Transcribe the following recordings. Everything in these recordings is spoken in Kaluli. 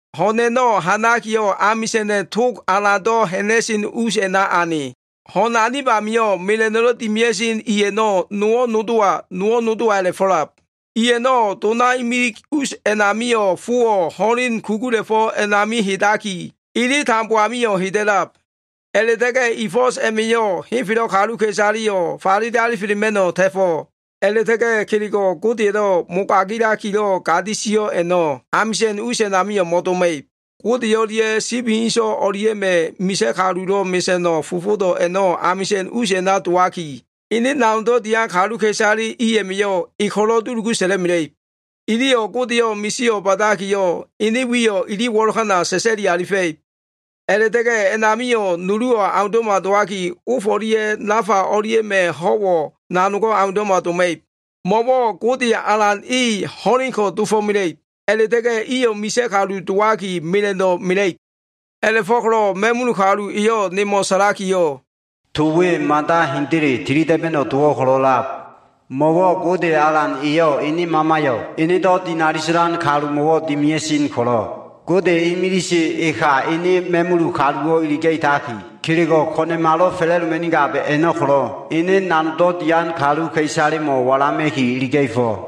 Ho꞉n a꞉no꞉ ha꞉nakiyo꞉, amisa꞉na꞉ tog alan ha꞉na꞉sen us a꞉na ane. Ho꞉n anib amio꞉, mela꞉no꞉lo꞉ dimia꞉sen i a꞉no꞉ nowo꞉ nodowa, nowo꞉ nodowa, a꞉la꞉fo꞉lab. I a꞉no꞉ dona imilig us a꞉namio꞉ fowo꞉ ho꞉len kugula꞉fo꞉ a꞉nami hedaki, ele tambo amio꞉ heda꞉lab. A꞉la꞉ta꞉ga꞉ i fo꞉s a꞉ma꞉yo꞉ henfelo꞉ kaluka꞉isaleyo꞉ falele alifelema꞉no꞉ ta꞉fo꞉. A꞉la꞉ta꞉ga꞉ kelego꞉ Godeya꞉lo꞉ mogailakilo꞉ gadi sio꞉ a꞉no꞉ amisa꞉n us a꞉namio꞉ mo꞉doma꞉ib. Gode o꞉lia꞉ Sibi inso꞉ o꞉lia꞉ma꞉ misa꞉ kalulo꞉ mesa꞉no꞉ fofodo꞉ a꞉no꞉ amisa꞉n us a꞉na dowaki, ene nanogdo꞉ dian kaluka꞉isale i a꞉ma꞉yo꞉ e ko꞉lo꞉ dulugu sa꞉la꞉mela꞉ib. Iliyo꞉ Godeyo꞉ misio꞉ ba꞉dakiyo꞉, ene wiyo꞉ ili wo꞉lokana sa꞉sa꞉li alifa꞉ib. A꞉la꞉ta꞉ga꞉ a꞉namio꞉ nuluwo꞉ aundo꞉ma dowaki, of o꞉lia꞉ nafa o꞉lia꞉ma꞉ ho꞉wo꞉ nanogo꞉ aundo꞉ma doma꞉ib. Mo꞉wo꞉ Gode Alan E ho꞉lenko꞉ dofo꞉mela꞉ib. A꞉la꞉ta꞉ga꞉ iyo꞉ misa꞉ kalu dowaki mela꞉no꞉ mela꞉ib. A꞉la꞉fo꞉ko꞉lo꞉ ma꞉mul kalu eyo꞉ nemo꞉ sa꞉lakiyo꞉, “To we mada hendele tilida꞉ba꞉no꞉ dowo꞉ ko꞉lo꞉lab. Mo꞉wo꞉ Gode Alan eyo꞉ ene Mamayo꞉ enedo꞉ dinali sa꞉lan kalumo꞉wo꞉ dimia꞉sen ko꞉lo꞉, Gode imilise eka ene ma꞉mul kaluwo꞉ iliga꞉taki, kelego꞉ ko꞉na꞉malo꞉ fa꞉la꞉doma꞉nigab a꞉no꞉ ko꞉lo꞉ ene nanogdo꞉ dian kaluka꞉isalemo꞉ walama꞉ki iliga꞉fo꞉.”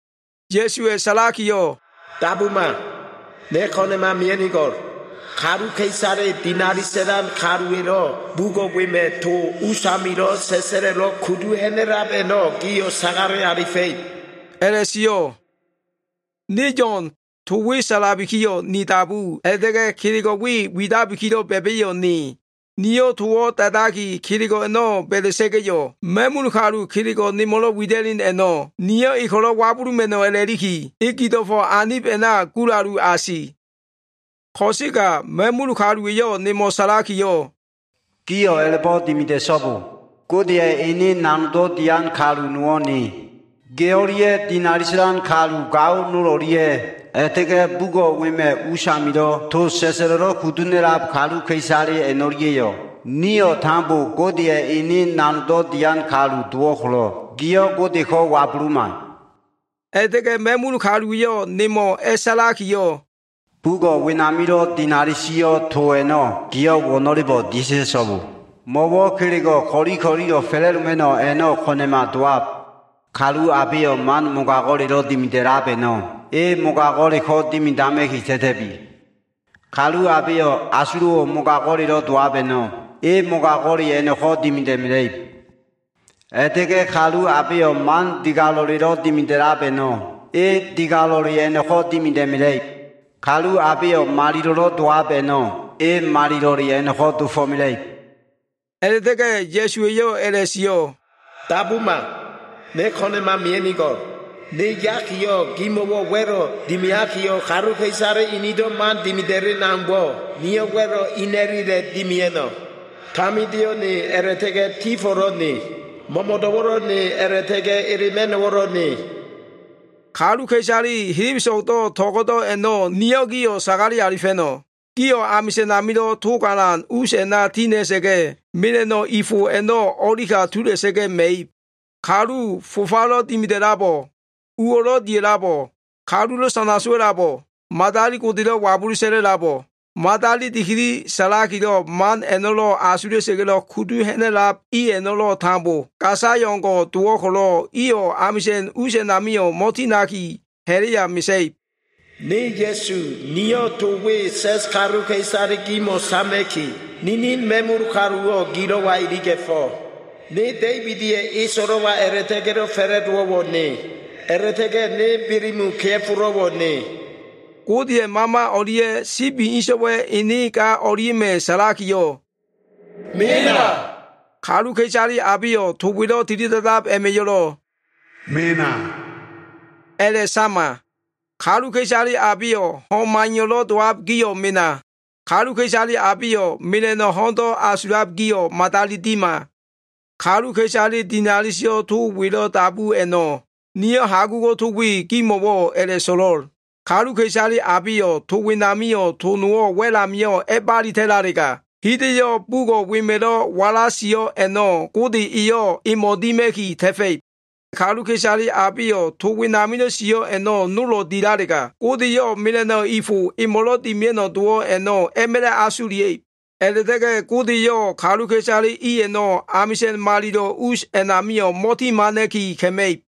Ya꞉suwa꞉ sa꞉lakiyo꞉, “Dabuma. Ne ko꞉na꞉ma mia꞉nigo꞉l. Kaluka꞉isale dinali sa꞉lan kaluwa꞉lo꞉ to bugo꞉ wema꞉ usamilo꞉ sa꞉sa꞉lo꞉lo꞉ kudu ha꞉na꞉lab a꞉no꞉, gio꞉ sagale alifa꞉ib” a꞉la꞉sio꞉. Ne Yo꞉n. To we sa꞉labikiyo꞉ ni dabu, a꞉la꞉ta꞉ga꞉ kelego꞉ we widabikilo꞉ ba꞉ba꞉yo꞉ ne. Niyo꞉ towo꞉ da꞉daki, kelego꞉ a꞉no꞉ ba꞉da꞉sa꞉ga꞉yo꞉, ma꞉mul kalu kelego꞉ nemo꞉lo꞉ wida꞉len a꞉no꞉, niyo꞉ e ko꞉lo꞉ wabuluma꞉no꞉ a꞉la꞉liki, e gido꞉fo꞉ anib a꞉na gulalu asi. Ko꞉sega ma꞉mul kaluwa꞉yo꞉ nemo꞉ sa꞉lakiyo꞉, “Giyo꞉ a꞉la꞉bo꞉ dimida꞉so꞉bo. Godeya꞉ ene nanogdo꞉ dian kalu nowo꞉ ne. Ge o꞉lia꞉ dinali sa꞉lan kalu gao nol o꞉lia꞉, a꞉la꞉ta꞉ga꞉ bugo꞉ wema꞉ usamilo꞉ to sa꞉sa꞉lo꞉lo꞉ kudu ha꞉na꞉lab kaluka꞉isale a꞉no꞉lia꞉yo꞉, nio꞉ tambo Godeya꞉ ene nanogdo꞉ dian kaluwo꞉ dowo꞉ ko꞉lo꞉, giyo꞉ Godeko꞉ wabuluma!” A꞉la꞉ta꞉ga꞉ ma꞉mul kaluwa꞉yo꞉ nemo꞉ a꞉sa꞉lakiyo꞉, “Bugo꞉ wenamilo꞉ dinali sio꞉ to a꞉no꞉, giyo꞉ wo꞉no꞉lebo꞉ dia꞉ ta꞉so꞉bo. Mo꞉wo꞉ kelego꞉ ko꞉li ko꞉lilo꞉ fa꞉la꞉doma꞉no꞉ a꞉no꞉ ko꞉na꞉ma dowab. Kalu abeyo꞉ man mogago꞉lelo꞉ dimida꞉lab a꞉no꞉, e mogago꞉le ko꞉ dimidama꞉ki ta꞉ta꞉bi. Kalu abeyo꞉ asulo꞉wo꞉ mogago꞉lelo꞉ dowab a꞉no꞉, e mogago꞉le a꞉no꞉ko꞉ dimida꞉mela꞉ib. A꞉la꞉ta꞉ga꞉ kalu abeyo꞉ man digalo꞉lelo꞉ dimida꞉lab a꞉no꞉, e digalo꞉le a꞉no꞉ko꞉ dimida꞉mela꞉ib. Kalu abeyo꞉ malilo꞉lo꞉ dowab a꞉no꞉, e malilo꞉le a꞉no꞉ko꞉ dofo꞉mela꞉ib.” A꞉la꞉ta꞉ga꞉ Ya꞉su eyo꞉ a꞉la꞉sio꞉, “Dabuma! Ne ko꞉na꞉ma mia꞉nigo꞉l. Ne yakiyo꞉, gimo꞉wo꞉ wa꞉lo꞉ dimiakiyo꞉, kaluka꞉isale inido꞉ man dimida꞉len aumbo꞉, niyo꞉ wa꞉lo꞉ ina꞉lile dimia꞉no꞉. Tamindeyo꞉ ne, a꞉la꞉ta꞉ga꞉ tifo꞉lo꞉ ne. Mo꞉mo꞉do꞉wo꞉lo꞉ ne, a꞉la꞉ta꞉ga꞉ elema꞉no꞉wo꞉lo꞉ ne.” Kaluka꞉isale helebeso꞉gdo꞉ to꞉go꞉do꞉ a꞉no꞉ niyo꞉ gio꞉ sagale alifa꞉no꞉. Gio꞉ amisa꞉n amilo꞉ tog alan us a꞉na tina꞉sa꞉ga꞉, mela꞉no꞉lo꞉ dimia꞉sen i fo a꞉no꞉ o꞉li ka tula꞉sa꞉ga꞉ ma꞉ib. Kalu fofalo꞉ dimida꞉labo꞉, uwo꞉lo꞉ dia꞉labo꞉, kalulo꞉ sana sowa꞉labo꞉, madali godelo꞉ wabulu sa꞉la꞉labo꞉, madali dikili sa꞉lakilo꞉ man a꞉no꞉lo꞉ asula꞉sa꞉ga꞉lo꞉ kudu ha꞉na꞉lab i a꞉no꞉lo꞉ tambo gasayo꞉ o꞉ngo꞉ dowo꞉ ko꞉lo꞉, iyo꞉ amisa꞉n us a꞉namio꞉ mo꞉tinaki, ha꞉la꞉ya mesa꞉ib. “Ne Ya꞉su, niyo꞉ to we sa꞉s kaluka꞉isale gimo꞉ sama꞉ki, ninin ma꞉mul kaluwo꞉ gilo꞉wa iliga꞉fo꞉. Ne Da꞉ibida꞉ eso꞉lo꞉wa a꞉la꞉ta꞉ga꞉lo꞉ fa꞉la꞉dowo꞉wo꞉ ne. A꞉la꞉ta꞉ga꞉ ne Belemu kea꞉folo꞉wo꞉ ne.” Godeya꞉ Mama o꞉lia꞉ Sibi inso꞉wa꞉ ene ga o꞉lia꞉ma꞉ sa꞉lakiyo꞉, “Mena!” Kaluka꞉isale abeyo꞉ to welo꞉ tilida꞉dab a꞉ma꞉yo꞉lo꞉, “Mena!” a꞉la꞉sama. Kaluka꞉isale abeyo꞉ ho꞉n maiyo꞉lo꞉ dowab gio꞉ mena. Kaluka꞉isale abeyo꞉ mela꞉no꞉ ho꞉ndo꞉ asulab gio꞉ madali dima. Kaluka꞉isale dinali sio꞉ to welo꞉ dabu a꞉no꞉, niyo꞉ hagugo꞉ to we gimo꞉wo꞉ a꞉la꞉so꞉lo꞉l, “Kaluka꞉isale abeyo꞉ to wenamio꞉ to nowo꞉ wa꞉l amio꞉ a꞉balitalega, hida꞉yo꞉ bugo꞉ wema꞉lo꞉ wala sio꞉ a꞉no꞉ Gode eyo꞉ emo꞉ dima꞉ki ta꞉fa꞉ib. Kaluka꞉isale abeyo꞉ to wenamilo꞉ sio꞉ a꞉no꞉ nolo꞉ dilalega, Gode eyo꞉ mela꞉no꞉ i fo emo꞉lo꞉ dimia꞉no꞉ dowo꞉ a꞉no꞉ a꞉ma꞉la꞉ asulia꞉ib.” A꞉la꞉ta꞉ga꞉ Gode eyo꞉ kaluka꞉isale i a꞉no꞉ amisa꞉n malilo꞉ us a꞉namio꞉ mo꞉timana꞉ki ka꞉ma꞉ib.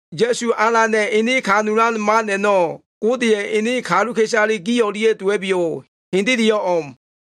Ya꞉su Alana꞉ ene kanulan man a꞉no꞉ Godeya꞉ ene kaluka꞉isale gi o꞉lia꞉ dowa꞉biyo꞉. Hendeleyo꞉ o꞉m.